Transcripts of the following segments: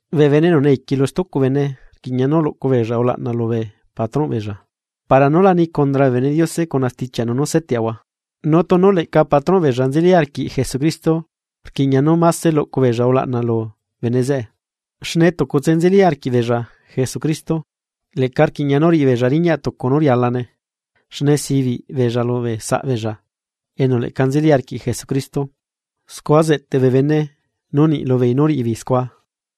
Bee bene enu neiqui lu stucu bene rquiꞌña nú luꞌcu beella ulaꞌna lubee patrónꞌ beella, para nú la ni condra bee bene Diose cuna stichiaꞌnu nú seteꞌahua. Nu tunu leꞌca patrón beella nzeli arquiꞌ Jesucristo, rquiꞌña nú máse luꞌcu beella ulaꞌna lu bene zeꞌe, xne tucutse nzeli arquiꞌbeella Jesucristo, leꞌca rquiꞌña nú riꞌi beella riñaꞌ tucu nú rialane, xne sibiꞌ beella lubee saꞌbeella enu leꞌca nzeli arquiꞌ Jesucristo. Scua zeꞌteꞌ bee bene nu niꞌ lubeei nú riꞌibeei scua.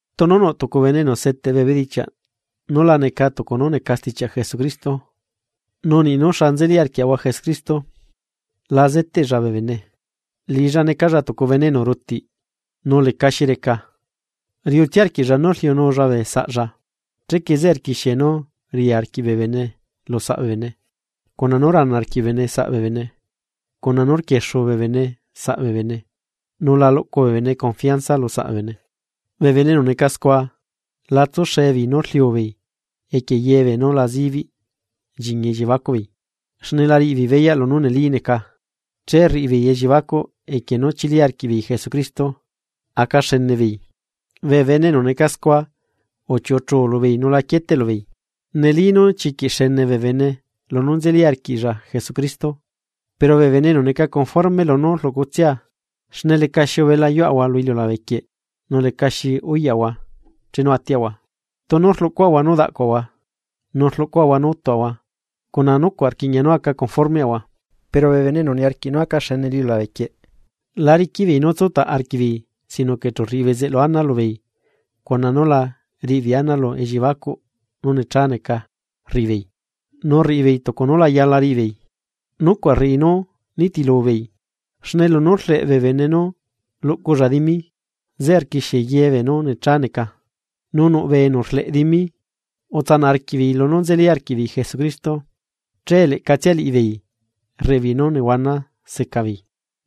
Tunu nuꞌ tucu bene enu seteꞌ bee bedichiaꞌ nú la neca tucu nú neca stichiaꞌ Jesucristo nu niꞌ nú xa nzeli arquiaꞌahua Jesucristo la zeteꞌlla bee bene, liꞌilla necalla tucu bene enu rutiꞌ nu lecaxi reca. Riuꞌtsia arquiꞌlla nú rliunulla bee saꞌlla, chequie zeꞌe rquixie nú ria arquiꞌ bee bene lu saꞌ bee bene, cuna nú rana arquiꞌ bee bene saꞌ bee bene, cuna nú rquiexu bee bene bee saꞌ bee bene nu la luꞌcu bee bene confianza lu saꞌ bee bene, bee bene enu neca scua, la tsuxe beei nú rliu beei equie ye beenú la zibiꞌ nchiñi elliebacuꞌbeei, xne la riꞌi beei beyaꞌ lunú neli neca, che rriꞌi beei elliebacuꞌ equie nú chili arquiꞌbeei Jesucristo aca xene beei. Bee bene enu neca scua uchiuꞌuchu lubeei nu la quieteꞌlu beei. Neli nu chiquiꞌ xene bee bene lunú nzeli arquiꞌlla Jesucristo, pero bee bene enu neca conforme lunú rluꞌcutsia. Xne lecaxi ubela yuaꞌahua lu iliulabe quieꞌ, nu lecaxi uyaꞌahua chenu atiaꞌahua. Tunu rluꞌcuaꞌahua nú daꞌcuaꞌahua, nu rluꞌcuaꞌahua nú utuaꞌahua cuna nucuaꞌ rquiꞌña nu aca conformeꞌahua. Pero bee bene enu niarquiꞌ nú aca xene lu iliulabe quieꞌ la riquiꞌ beei nú tsutaꞌ arquiꞌbeei sino que chu rriꞌi bezeꞌlu ana lubeei cuna nú la riꞌibeei ana lu elliebacuꞌ nú necha neca rriꞌi beei, nu rriꞌibeei tucu nú la yala riꞌi beei, nucuaꞌ rriꞌi nú nitilu beei. Xne lunú rleꞌ bee bene nú luꞌculla dimi, zeꞌe rquixie ye beenú necha neca, nu nuꞌ bee enu rleꞌ dimi utsanaꞌ arquiꞌbeei lunú nzeli arquiꞌbeei Jesucristo, che leꞌcatsia liꞌibeei rriꞌibeei nú nehuana seca beei.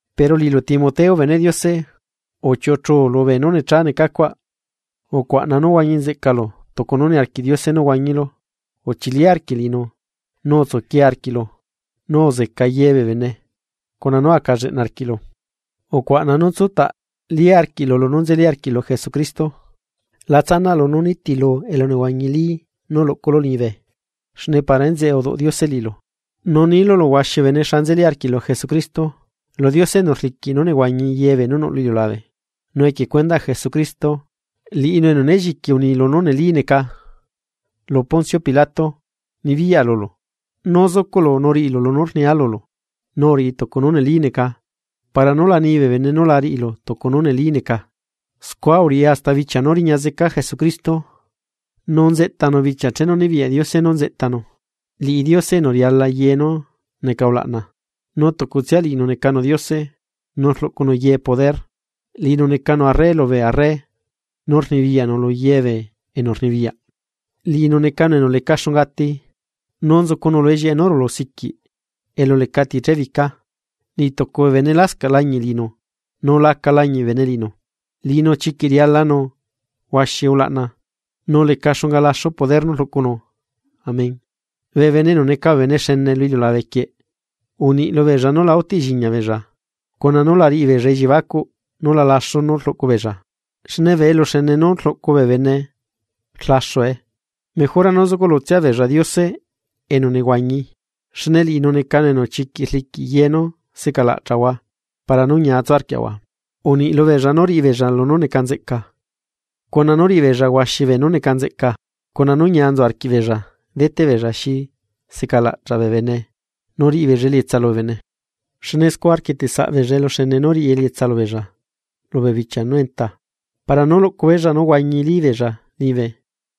Pero liꞌilu Timoteo beneꞌ Diose, uchiuꞌuchuu lubee nú necha necacuaꞌ, ucuaꞌna nú huañi nzeꞌcalu tucu nú niarquiꞌ Diose nú huañilu, uchili arquiꞌ liꞌinu, nu utsuquie arquiꞌ, nu uzeca ye bee bene, cuna nú aca lleꞌna arquiꞌ. Ucuaꞌna nú tsutaꞌli arquiꞌlu lunú nzeli arquiꞌlu Jesucristo. La tsanaꞌlu nú nitilu elunehuañili nú luꞌculu liñibe xne para enzeꞌe uduꞌ Diose liꞌilu, nu nilu lu huaxi bee bene xa nzeli arquiꞌlu Jesucristo. Lu Diose enu rliquiꞌ nú nehuañi ye beenú nuꞌ lu iliulabe, nu equie cuendaꞌ Jesucristo liꞌinu enu né lliqui uni lunú neli neca lu Poncio Pilato, nibiyaꞌa lulu, nú zucuꞌlu nú riꞌilu lunú rnia lulu, nu uriꞌi tucu nú neli neca para nú la ni bee bene nú la riꞌilu tucu nú neli neca, scua uriꞌi hasta bichia nú riña zeca Jesucristo. Nu nzeꞌtanu bichia chenu nibiyaꞌ Diose nú nzeꞌtanu, liꞌi Diose enu riala ye nú neca ulaꞌna, nu tucutsia liꞌinu necanu Diose, nu rluꞌcunu ye poder, liꞌinu necanu Arre lubee arre nu Rnibiyaꞌnu lu ye bee enu rnibiyaꞌ. Liꞌinu necanu enu leca xunga ati, nu nzucunu lu ellieꞌe nú rulu siquiꞌ elu lecati chébica. Niꞌ tucu bee bene lascaꞌ lañiꞌ liꞌinu, nu laca lañiꞌ bee bene liꞌinu. ¡Liꞌinu chiquiꞌ rialanu huaxi ulaꞌna, nu leca xunga laxu poder nú rluꞌcunu! Amén. Bee bene enu neca bene xene lu iliulabe quieꞌ, uniꞌ lubeella nú la utiꞌ lliñia beella, cuna nú la riꞌi beella elliebacuꞌ nú la laxu nú rluꞌcu beella, xne bee eluxene nú rluꞌcu bee bene rlaxue, mejora nú zucuꞌlutsia beella Diose enu nehuañi, xne liꞌinu necanu enu chiquiꞌ rliquiꞌ ye nú seꞌcalaꞌchaꞌahua para nú ñia tsu arquiaꞌahua. Uniꞌ lubeella nú riꞌi beella lunú neca nzeꞌca, cuna nú riꞌi beella huaxi beenú neca nzeꞌca, cuna nú ñia nzu arquiꞌbeella deteꞌ beella xi secalaꞌchaꞌ bee bene nu riꞌi beella elietsa lubee bene, xne scua rquieteꞌ saꞌ beella eluxene nú riꞌi elietsa lubeella lubee bichia nú enta, para nú luꞌcu beella nú huañili beella liñibe.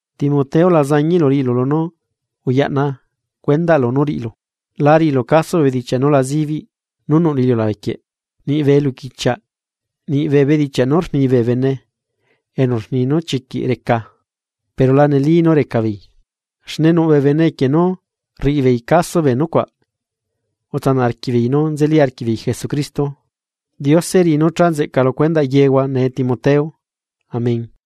Timoteo la zañiꞌlu riꞌilu lunú uyaꞌna cuendaꞌlu nú riꞌilu, la riꞌilu caso bee bedichiaꞌ nú la zibiꞌ nú nuꞌ lu iliulabe quieꞌ, niꞌ bee eluquichiaꞌ, nu niꞌ bee bedichiaꞌ nú rni bee bene enu rni nú chiquiꞌ reca, pero la neli nú reca beei. Xne nuꞌ bee bene equie nú rriꞌi beei caso bee nucuaꞌ, utsanaꞌ arquiꞌbeei nú nzeli arquiꞌbeei Jesucristo. Diose riꞌi nú cha nzeꞌca lu cuendaꞌ yehua nee Timoteo. Amén.